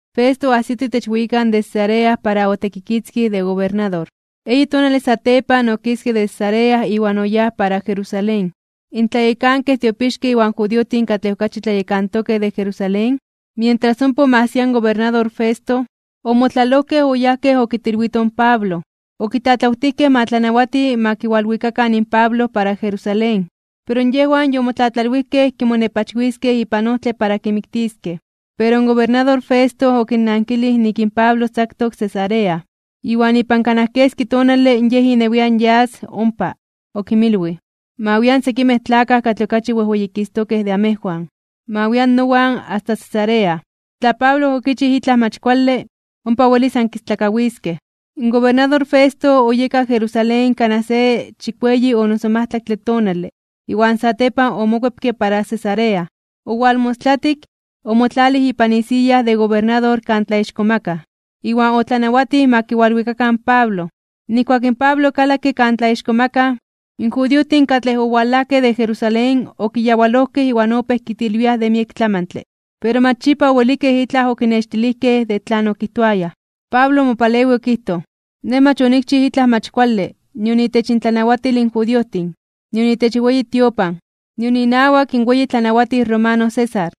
Festo oajsito itech weyikan de Cesarea para otekikitzkij de gobernador. Eyi tonale satepan okiske de Cesarea iwan oyáj para Jerusalén. In tlayekankej tiopixkej iwan judiojtin katlej okachi tlayekantokej de Jerusalén, mientras ompa omajsia in gobernador Festo, omotlalojkej oyajkej okitilwitoj in Pablo. Okitlatlawtijkej ma tlanawati ma kiwalwikakan in Pablo para Jerusalén. Pero yejwan yomotlatlalwijkej kimonepachwiskej ipan ojtle para kimiktiskej. Pero in gobernador Festo okinnankilij nik in Pablo tzaktok Cesarea, iwan ipan kanaj keski tonale yej inewian yas ompa. Okinmilwij: ―Ma wian sekimej tlakaj katlej okachi wejweyikistokej de amejwan. Ma wian nowan asta Cesarea. Tla Pablo okichij itlaj mach kuale, ompa welis ankistlakawiskej. In gobernador Festo oyeka Jerusalén kanaj se chikueyi o noso majtlaktle tonale, iwan satepan omokuepke para Cesarea. Owalmostlatik, omotlalij ipan isiya de gobernador kan tlaixkomakaj (tlatzonmanaj), iwan otlanawatij ma kiwalwikakan in Pablo. Nijkuak in Pablo okalakke kan tlaixkomakaj, in judiojtin katlej owalajkej de Jerusalén okiyawalojkej iwan opéj kitilwiaj de miek tlamantle, pero mach yipa owelikej itlaj okinextilijkej de tlan okijtoayaj. Pablo omopalewij okijtoj: ―Nej mach onikchij itlaj mach kuale, nion itech intlanawatil in judiojtin, nion itech weyi tiopan, iwan nion inawak in weyi tlanawatij romano César.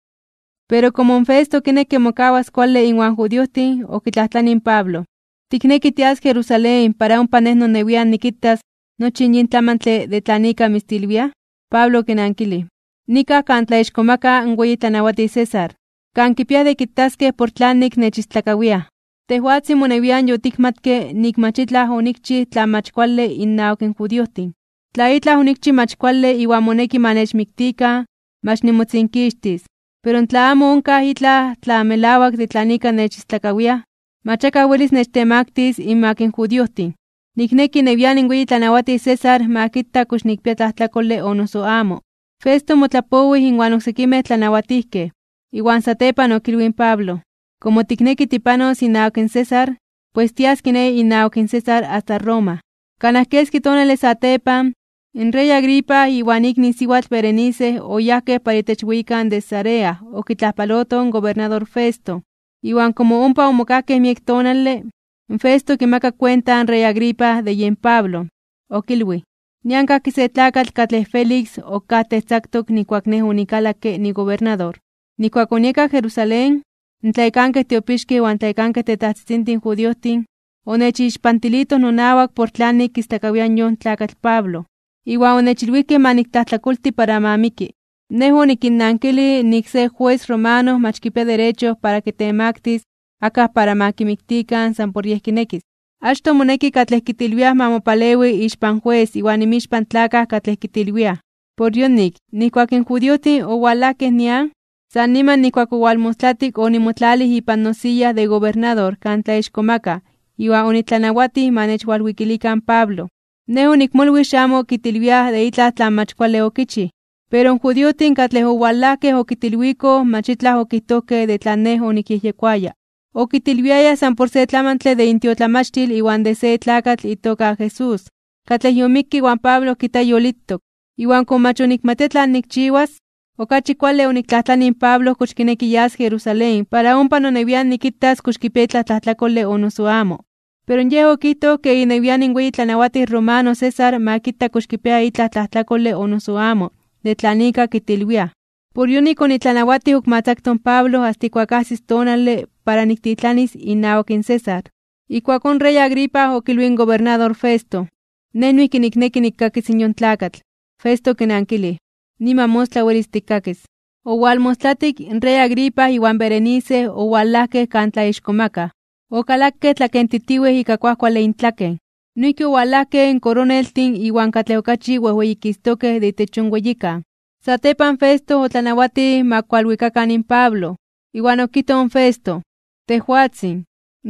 Pero komo in Festo okinekke mokawas kuale iwan judiojtin, okitlajtlanij in Pablo: ―¿Tikneki tias Jerusalén para ompa nej nonewian nikitas nochi yin tlamantle de tlan ika mitzistlakawiaj? Pablo okinankilij: ―Nikaj kan tlaixkomaka (tlatzonmanaj) in weyi tlanawatij César, kan kipiaj de kitaskej por tlanik nechistlakawiaj. Tejwatzin monewian yotikmatke nik mach itlaj onikchij tlan mach kuale innawak in judiojtin. Tla itlaj onikchij mach kuale iwan moneki ma nechmiktikan, mach nimotzinkixtis. Pero tla amo onkaj itlaj tlan melawak de tlan ika nechistlakawiaj, mach akaj welis nechtemaktis (nechtemaktilis) inmak in judiojtin. Nikneki inewian in weyi tlanawatij César ma kita kox nikpia tlajtlakole o noso amo. Festo omotlapowij inwan oksekimej tlanajnawatijkej, iwan satepan okilwij in Pablo: ―Komo tikneki tipanos inawak in César, pues tias kiné inawak in César asta Roma. Kanaj keski tonale satepan, in rey Agripa iwan ikni siwatl Berenice oyajkej para itech weyikan de Cesarea okitlajpalotoj in gobernador Festo. Iwan komo ompa omokajkej miek tonale, Festo okimakak kuenta in rey Agripa de yen Pablo, okilwij: ―Nian kajki se tlakatl katlej Félix okajtej tzaktok nijkuak nej onikalakke nigobernador. Nijkuak onieka Jerusalén, in tlayekankej tiopixkej iwan in tlayekankej tetajtzitzintin judiojtin, onechixpantilitoj nonawak por tlanik kistlakawiaj yon tlakatl Pablo, iwan onechilwijkej ma niktlajtlakolti para ma miki. Nej onikinnankilij nik se jues romano mach kipia derecho para kitemaktis (kitemaktilis) akaj para ma kimiktikan san por yej kinekis. Achtoj moneki katlej kitilwiaj ma mopalewi ixpan jues iwan inmixpan tlakaj katlej kitilwiaj. Por yonik, nijkuak in judiojtin owalajkej nian, san niman nijkuak owalmostlatik onimotlalij ipan nosiya de gobernador kan tlaixkomakaj (tlatzonmanaj) iwan onitlanawatij ma nechwalwikilikan in Pablo. Nej onikmolwij xamo kitilwiaj de itlaj tlan mach kuale okichij, pero in judiojtin katlej owalajkej okitilwikoj mach itlaj okijtojkej de tlan nej onikyejyekoaya. Okitilwiayaj san por se tlamantle de intiotlamachtil iwan de se tlakatl itoka Jesús, katlej yomikke iwan Pablo kijta yolitok. Iwan komo mach onikmatia tlan nikchiwas, okachi kuale oniktlajtlanij in Pablo kox kineki yas Jerusalén para ompa nonewian nikitas kox kipia itlaj tlajtlakole o noso amo. Pero yej okijtoj ke inewian in weyi tlanawatij romano César ma kita kox kipia itlaj tlajtlakole o noso amo de tlan ika kitilwiaj. Por yonik onitlanawatij ok ma tzakto in Pablo asta ijkuak ajsis tonale para niktitlanis inawak in César. Ijkuakón in rey Agripa okilwij in gobernador Festo: ―Nej noijki nikneki nikkakis in yon tlakatl. Festo okinankilij: ―Niman mostla welis tikkakis. Owalmostlatik, in rey Agripa iwan Berenice owalajkej kan tlaixkomakaj (tlatzonmanaj), okalakej tlakentitiwej ika kuajkuale intlaken. Noijki owalajkej in koroneltin iwan katlej okachi wejweyikistokej (wejweyititokej) de itech yon weyikan. Satepan Festo otlanawatij ma kualwikakan in Pablo. Iwan okijtoj in Festo: ―Tejwatzin,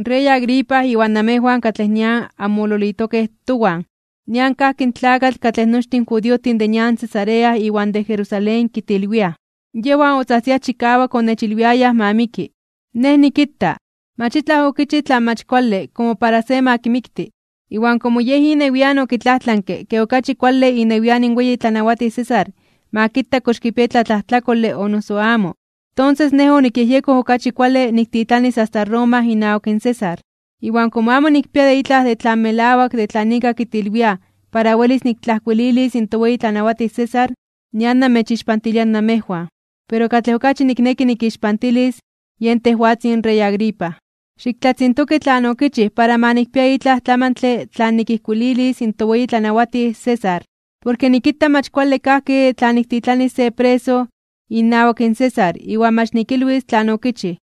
rey Agripa iwan namejwan katlej nian anmololitokej towan. Nian kajki in tlakatl katlej nochtin in judiojtin de nian Cesarea iwan de Jerusalén kitilwiaj. Yejwan otzajtziaj chikawak onechilwiayaj ma miki. Nej nikita, mach itlaj okichij tlan mach kuale komo para se ma kimikti. Iwan komo yej inewian okitlajtlanke ke okachi kuale inewian in weyi tlanawatij César ma kita kox kipia itlaj tlajtlakole o noso amo, tonses nej onikyejyekoj okachi kuale niktitlanis asta Roma inawak César. Iwan komo amo nikpia itlaj de tlan melawak de tlan ika kitilwiaj para welis niktlajkuililis in toweyi tlanawatij César, nian namechixpantilia namejwan, pero katlej okachi nikneki nikixpantilis, yen tejwatzin rey Agripa. Xiktlatzintoki tlan okichij para ma nikpia itlaj tlamantle tlan nikijkuililis in toweyi tlanawatij César. Porke nikita mach kuale kajki tla niktitlanis se preso inawak in César iwan mach nikilwis tlan okichij.